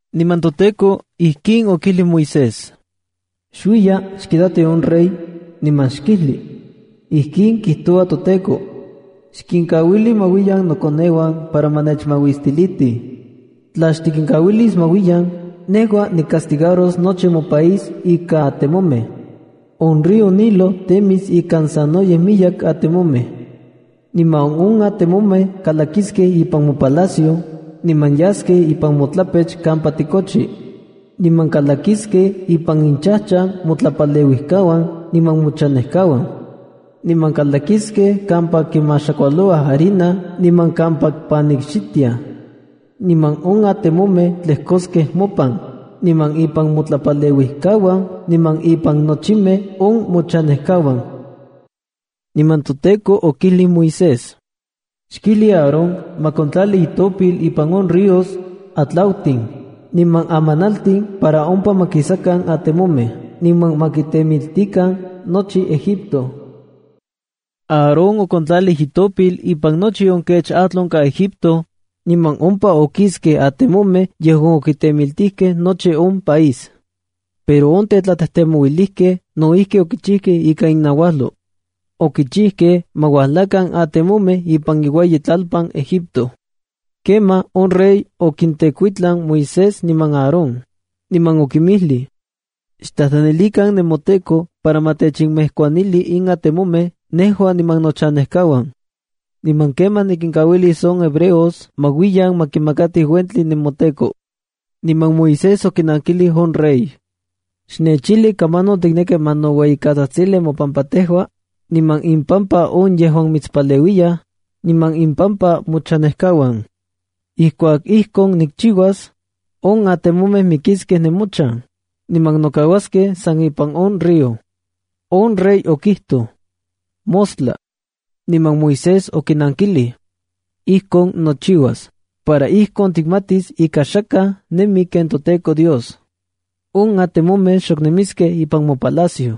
Niman toTEKO ijkin okijlij Moisés: —Xuiya, xkitati on rey, niman xkijli: Ijkin kijtoua toTEKO: “Xkinkauili ma uiyan nokoneuan para ma nechmauistilitij. Tla xtikinkauilis ma uiyan, nejua nicastigaros nochi mopaís ika atemomej. On río Nilo temis ikan sanoyej miyek atemomej. Niman on atemomej kalakiskej ipan mopalacio, niman yaskej ipan motlapech kampa tikochi. Niman kalakiskej ipan inchajchan motlapaleuijkauan niman mochanejkauan. Niman kalakiskej kampa kimaxakualouaj harina niman kampa panikxitiaj. Niman on atemomej tlejkoskej mopan, niman impan motlapaleuijkauan niman impan nochimej on mochanejkauan.” Niman toTEKO okijlij Moisés: —Xkijli Aarón ma kontlali itopil ipan on ríos, atlautin, niman amanaltin para ompa ma kisakan atemomej niman ma kitemitikan nochi Egipto. Aarón okontlalij itopil ipan nochi on kech atl onkaj Egipto, niman ompa okiskej atemomej yejuan okitemitikej nochi on país. Pero on tetlatejtemouilijkej no ijki okichijkej ika innauajlo. Okichijkej ma ualajkan atemomej ipan iueyitlalpan Egipto. Kemaj on rey okintekuitlan Moisés niman Aarón, niman okinmijlij: —Xtlajtlanilikan nemoTEKO para ma techejkuanili in atemomej nejua niman nochanejkauan. Niman kemaj nikinkauilis on hebreos ma uiyan ma kimakatij uentli nemoTEKO. Niman Moisés okinankilij on rey: —Xnechijli kamanon tikneki ma ninoueyikatsajtsali mopampa tejua, niman impampa on yejuan mitspaleuiyaj, niman impampa mochanejkauan. Ijkuak ijkon nikchiuas, on atemomej mikiskej nemochan, niman nokauaskej san ipan on río. On rey okijtoj: —Mostla. Niman Moisés okinankilij: —Ijkon nochiuas, para ijkon tikmatis ika xakaj nemi ken toTEKO Dios. On atemomej xok nemiskej ipan mopalacio.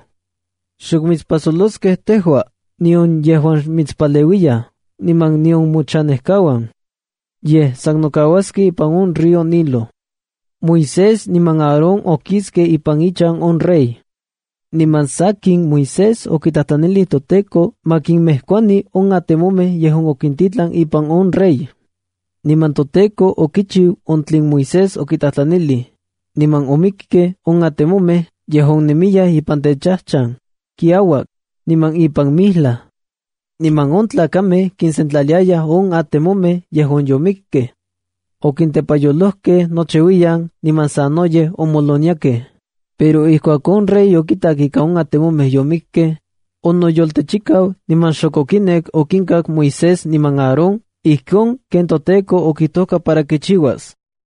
Xok mitspajsoloskej tejua, nion yejuan mitspaleuiyaj, niman nion mochanejkauan. Yej san nokauaskej ipan on río Nilo. Moisés niman Aarón okiskej ipan ichan on rey. Niman sakin, Moisés okitlajtlanilij toTEKO ma kinmejkuani on atemomej yejuan okintitlan ipan on rey. Niman toTEKO okichiu on tlen Moisés okitlajtlanij, niman omikkej on atemomej yejuan nemiyaj ipan techajchan, kiauak, niman ipan mijlaj. Niman on tlakamej kinsentlaliayaj on atemomej yejuan yomikkej. Okintepayolojkej nochiuiyan niman sanoyej omoloniakej. Pero ijkuak on rey okitak ika on atemomej yomikej, onoyoltechikau niman xok okinek okinkak Moisés niman Aarón ijkon ken toTEKO okijtojka para kichiuas.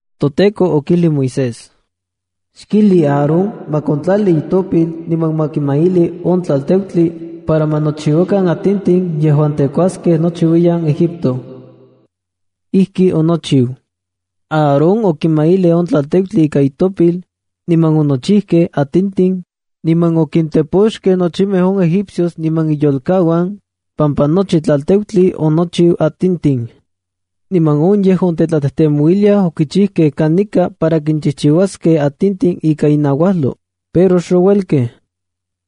ToTEKO okijlij Moisés: —Xkijli Aarón ma kontlali itopil niman ma kimaili on tlalteutli para ma nochiuakan atintin yejuan tekuaskej nochiuiyan Egipto. Ijki okichiu. Aarón okimailij on tlalteutli ika itopil, niman onochijkej atintin, niman okintepoxkej nochimej on egipcios niman inyolkauan, pampa nochi tlalteutli onochiu atintin. Niman on yejuan tetlatejtemouiliaj okichijkej kanika para kinchijchiuaskej atintin ika innauajlo, pero xouelkej.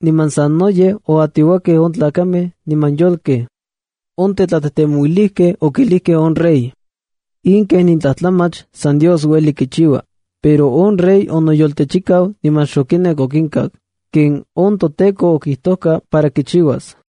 Niman sanoyej oatiouakej on tlakamej niman yolkej. On tetlatejtemouilijkej okilijkej on rey: —¡In kenin tlajtlamach san Dios ueli kichiua! Pero on rey onoyoltechikau niman xokinek okinkak, ken on toTEKO okijtoka para kichiuas.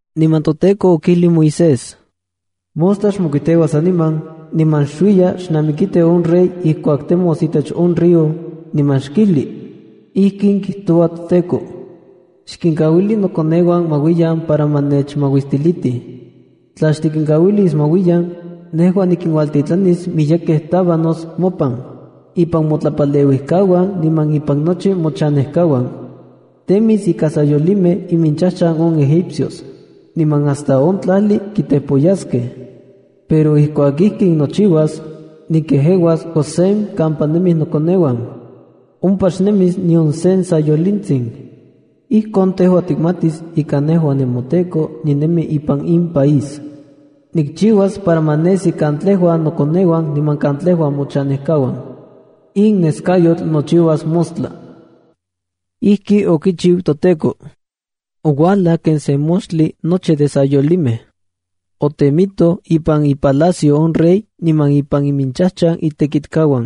Niman toTEKO okijlij Moisés: —Mostla xmokuiteua saniman niman xuiya xnamikiti on rey ijkuak temos itech on río, niman xkijli: “Ijkin kijtoua toTEKO: Xkinkauili nokoneuan ma uiyan para ma nechmauistilitij. Tla xtikinkauilis ma uiyan, nejua nikinuajtitlanis miyekej tabanosa mopan, ipan motlapaleuijkauan niman ipan nochi mochanejkauan. Temis ika sayolimej iminchajchan on Egipcios, niman hasta on tlajli kitepoyaskej. Pero ijkuak ijkin nochiuas, nikejeuas Gosén kampa nemij nokoneuan. Ompa xnemis nion se sayolintsin. Ijkon tejua tikmatis ika nejua nemoTEKO ninemi ipan in país. Nikchiuas para ma nesi katlejua nokoneuan niman katlejua mochanejkauan. In neskayotl nochiuas mostla.” Ijki okichiu toTEKO. Oualaj ken sen moxtli nochi de sayolimej. Otemitoj ipan ipalacio on rey niman ipan iminchajchan itekitkauan.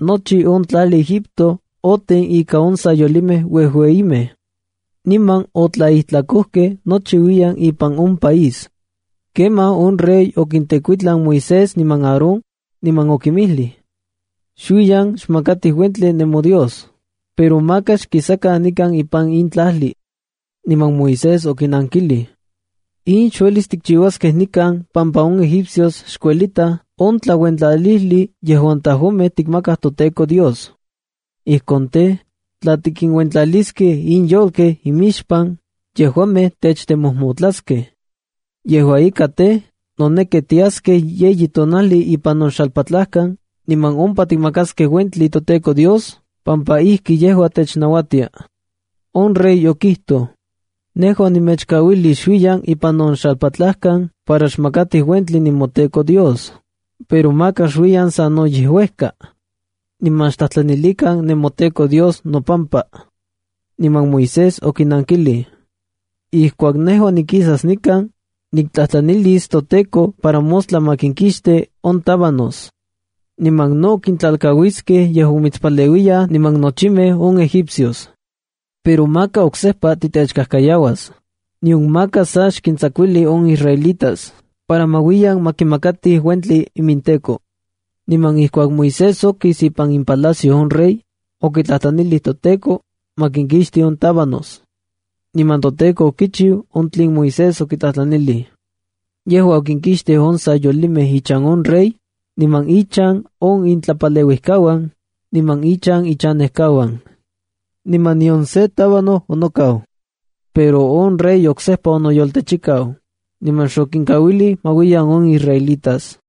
Nochi on tlajli Egipto oten ikan on sayolimej uejuejimej, niman otlaijtlakojkej nochiuiyan ipan on país. Kemaj on rey okintekuitlan Moisés niman Aarón, niman okinmijlij: —Xuiyan xmakatij uentli nemoDios, pero maka xkisakan nikan ipan in tlajli. Niman Moisés okinankilij: —In xuelis tikchiuaskej nikan pampa on egipcios xkuelitaj on tlauentlalijli yejuan tejuamej tikmakaj toTEKO Dios. Ijkon tej, tla tikinuentlaliskej in yolkej imixpan, yejuamej techtemojmotlaskej. Yejua ika tej, noneki tiaskej yeyi tonajli ipan on xalpatlajkan, niman ompa tikmakaskej uentli toTEKO Dios pampa ijki yejua technauatia. On rey okijtoj: —Nejua nemechkauilis xuiyan ipan on xalpatlajkan para xmakatij uentli nemoTEKO Dios, pero maka xuiyan sanoyej uejka. Niman xtlajtlanilikan nemoTEKO Dios nopampa. Niman Moisés okinankilij: —Ijkuak nejua nikisas nikan, niktlajtlanilis toTEKO para mostla ma kinkixti on tábanos. Niman no kintlalkauiskej yejuan mitspaleuiyaj niman nochimej on egipcios. Pero maka oksejpa titechkajkayauas, nion maka sa xkintsakuili on israelitas para ma uiyan ma kimakatij uentli iminTEKO. Niman ijkuak Moisés okis ipan ipalacio on rey, okitlajtlanilij toTEKO, ma kinkixti on tábanos. Niman toTEKO okichiu on tlen Moisés okitlajtlanilij. Yejua okinkixtij on sayolimej ichan on rey, niman inchan on itlapaleuijkauan, niman inchan ichanejkauan. Niman nion se tábano onokau. Pero on rey oksejpa onoyoltechikau, niman xokinkauilij ma uiyan on israelitas.